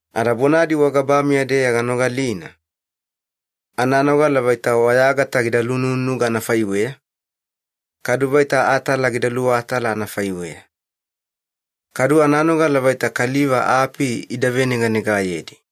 Ada bonadi wagabameya-deya ganogalina, ananogala vaita wayagata gida lunununuga anafaiweya, kadu vaita atala gida luwatala anafaiweya. Kadu ananogala vaita kaliva api ida veneganegayedi.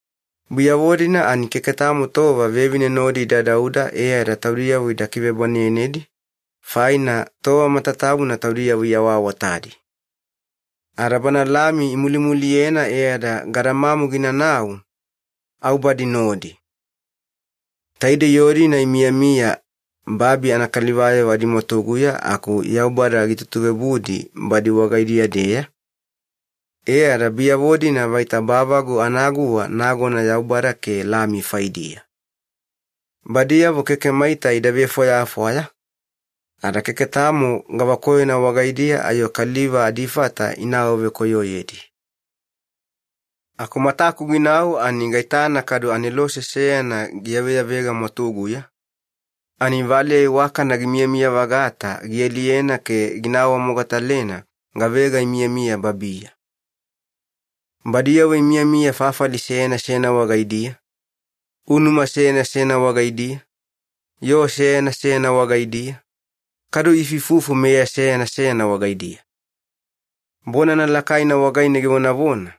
Biyavo-dina ani keke tamo tova vevine nodi ida dauda e ada taudiyavo ida kivebwanenedi, faina tova matatabuna taudiyavo iawaawatadi. Ada Bana Lami imulumuliyena e ada gadamamu ginanau, au badi nodi. Taidei yoo-dina imiyamiya babi anakalivayavo adimwatuguya aku Yaubada gitutuveobudi badi wagaidiya-deya, e ada biyavo-dina vaita bavagu anaguwa nagona Yaubada ke Lami faidiya. Badiyavo keke maita ida vefwayafwaya, ada keke tamo gavakoyona wagaidiya ayo kaliva adifata ina awavekoyoyedi. Aku mataku ginau ani gaitana kadu anelose seyana giyaveyavega mwatuguya, ani valeya iwakana gimiyamiya-vagata gialiyena ke gina awamogatalena gavega imiyamiya babiya. Badiyavo imiyamiya fafali seyana seyana wagaidiya, unuma seyana seyana wagaidiya, yoo seyana seyana wagaidiya, kadu iifuifufu meya seyana seyana wagaidiya. Bonana lakaina wagaine givonavona,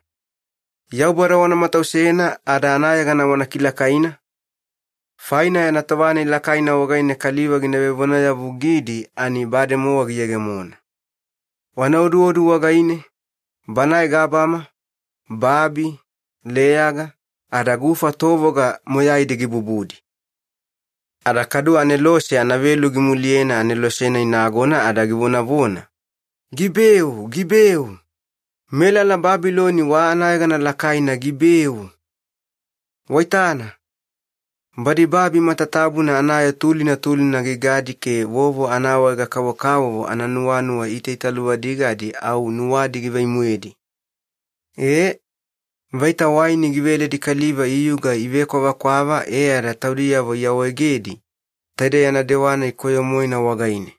“Yaubada wana matausena ada anayegana wana kilakaina, faina yana tova-nai lakaina wagaine kaliva gina vevonayavugidi ani bademowa giyegemona. Wana oduodu wagaine, Banae gabama, babi, leyaga, ada gufa tovoga moyaidi gibubudi.” Ada kadu anelose anavelu gimuliyena anelose-nai nagona ada givonavona, “Gibeu! Gibeu! Melala Babiloni wa anayegana lakaina gibeu! Waitana, badi babi matatabuna anayoo tulina tulina gigadi ke vovo anaawaega-kavokavovo ananuwanuwa itaitaluvadigadi au nuwadi givai-moedi. Ee, vaita waini giveledi kaliva iyuga ivekwavakwava e ada taudiyavo iawaegedi taide yana dewa-nai koyo-moena wagaine.”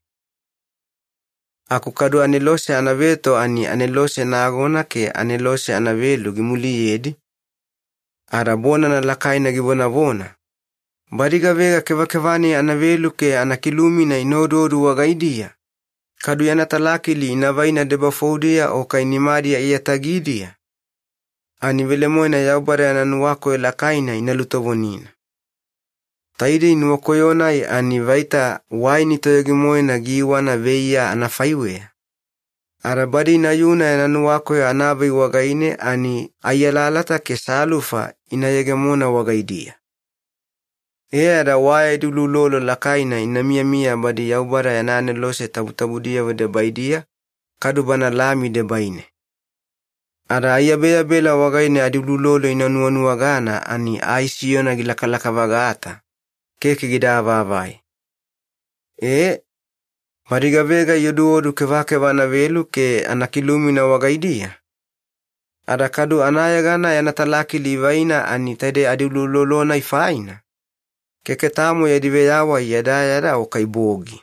Aku kadu anelose anaveto ani anelose nagona ke anelose anavelu gimuliyedi, ada bonana lakaina givonavona, “Badi gavega kevakeva-nai anavelu ke anakilumina ina oduodu wagaidiya, kadu yana talakili ina vaina debafoudiya o kai nimadi aiyatagidiya, ani velemoena Yaubada yana nuwakoyo lakaina ina lutovonina. Taidei nuwakoyo-nai ani vaita waini toyogi-moena giiwana veiya anafaiweya, ada badi inayuna yana nuwakoyo anavei wagaine ani ai alalata ke salufa ina yegemona wagaidiya. E ada wa yadi uloulolo lakaina ina miyamiya badi Yaubada yana anelose tabutabudiyavo debaidiya, kadu Bana Lami debaine. Ada aiyabeyabela wagaine adiuloulolo inuwanuwagana ani ai siyona gilakalaka-vagata, keke gida avaavai. Ee, badi gavega ioduodu kevakeva anavelu ke anakilumina wagaidiya, ada kadu anayegana yana talakili ivaina ani taide adiuloulolo-nai faina, keke tamo yadi veyawai yadayada o kai bogi.”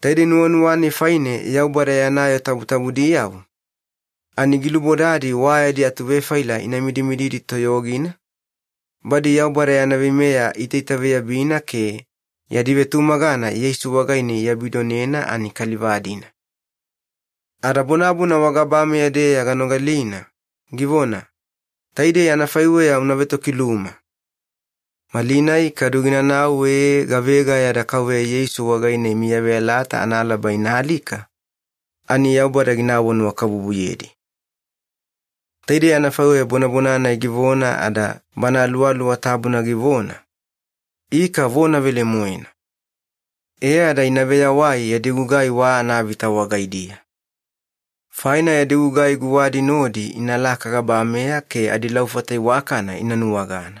Taidei nuwanuwa-nai faine Yaubada yana yoo tabutabudiyavo, ani gilubodadi wa yadi atuvefaila ina midimididi toyogina, badi Yaubada yana veimeya iitaitaveyabina ke yadi vetumagana Yeisu wagaine iabidonena ani kaliva-dina. Ada bonabona wagabameya-deya ganogalina, givona, “Taidei anafaiweya una vetokiluma. Malinai kadu ginanau ee gavega yada Kauveya Yeisu wagaine imiyaveyalata analaba ina alika, ani Yaubada gina awanuwakabubuyedi.” Taidei anafaiweya bonabona-nai givona ada Bana Aluwaluwa Tabuna givona, “Ika vona velemoena. E ada ina veyawai yadi gugai wa anavita wagaidiya. Faina yadi gugai guwadi nodi inalaka gabameya ke adilaufata iwakana ina nuwagana.”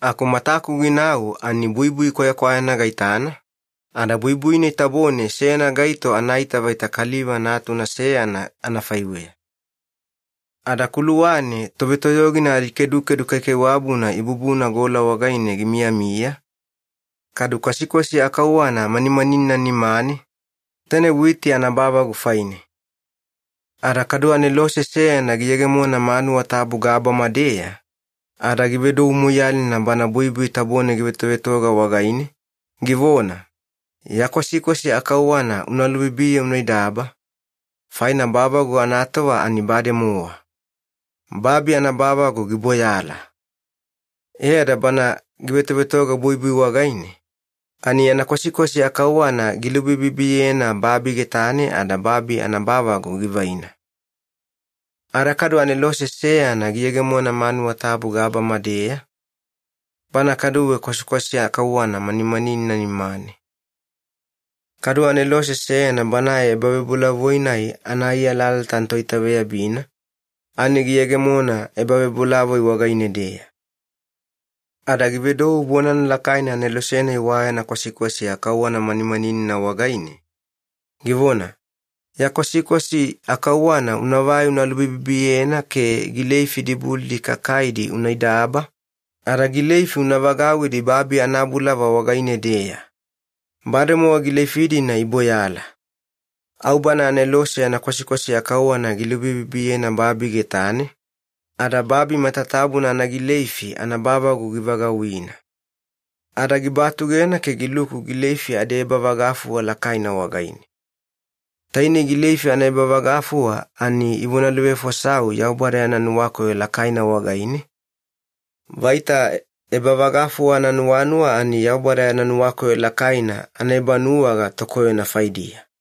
Aku mataku ginau ani buibui kwayakwayana gaitana, ada buibui-nai tabone seyana gaito anaita vaita kaliva natuna seyana anafaiweya. Ada kuluwane tovetoyogina adikedukedu kaikaiwabuna ibubuna gola wagaine gimiyamiya, kadu kwasikwasi akauwana manimaninina nimane, taine witi anabavagu faine. Ada kadu anelose seyana giyegemona manuwa tabu gabama-deya, ada givedou moiyalina banae buibui tabone givetovetoga wagaine, givona, “Ya kwasikwasi akauwana una lubibiye una idaba, faina bavagu anatova ani bademowa. Babi anabavagu giboyala.” E ada bana givetovetoga buibui wagaine, ani yana kwasikwasi akauwana gilubibibiyena babi getane ada babi anabavagu givaina. Ada kadu anelose seyana giyegemona manuwa tabu gabama-deya, banae kaduwe kwasikwasi akauwana manimaninina nimane. Kadu anelose seyana banae ebavebolavoi-nai ana ai alalata anatoitaveyabina, ani giyegemona ebavebolavoi wagaine-deya. Ada givedou bonana lakaina anelose-nai wa yana kwasikwasi akauwana manimaninina wagaine, givona, “Ya kwasikwasi akauwana unavai una lubibibiyena ke gileifi dibulidi kakaidi una idaba, ada gileifi una vagauwidi babi anabulava wagaine-deya. Bademowa gileifi-dina iboyala.” Au bana anelose yana kwasikwasi akauwana gilubibibiyena babi getane, ada babi matatabuna anagileifi anabavagu givagauwina. Ada gibatugena ke giluku gileifi adiebavagafuwa lakaina wagaine. Taine ‘gileifi anaebavagafuwa’ ani ivonaluvefosau Yaubada yana nuwakoyo lakaina wagaine, vaita ebavagafuwa ananuwanuwa ani Yaubada yana nuwakoyo lakaina anaebanuwaga tokoyona faidiya.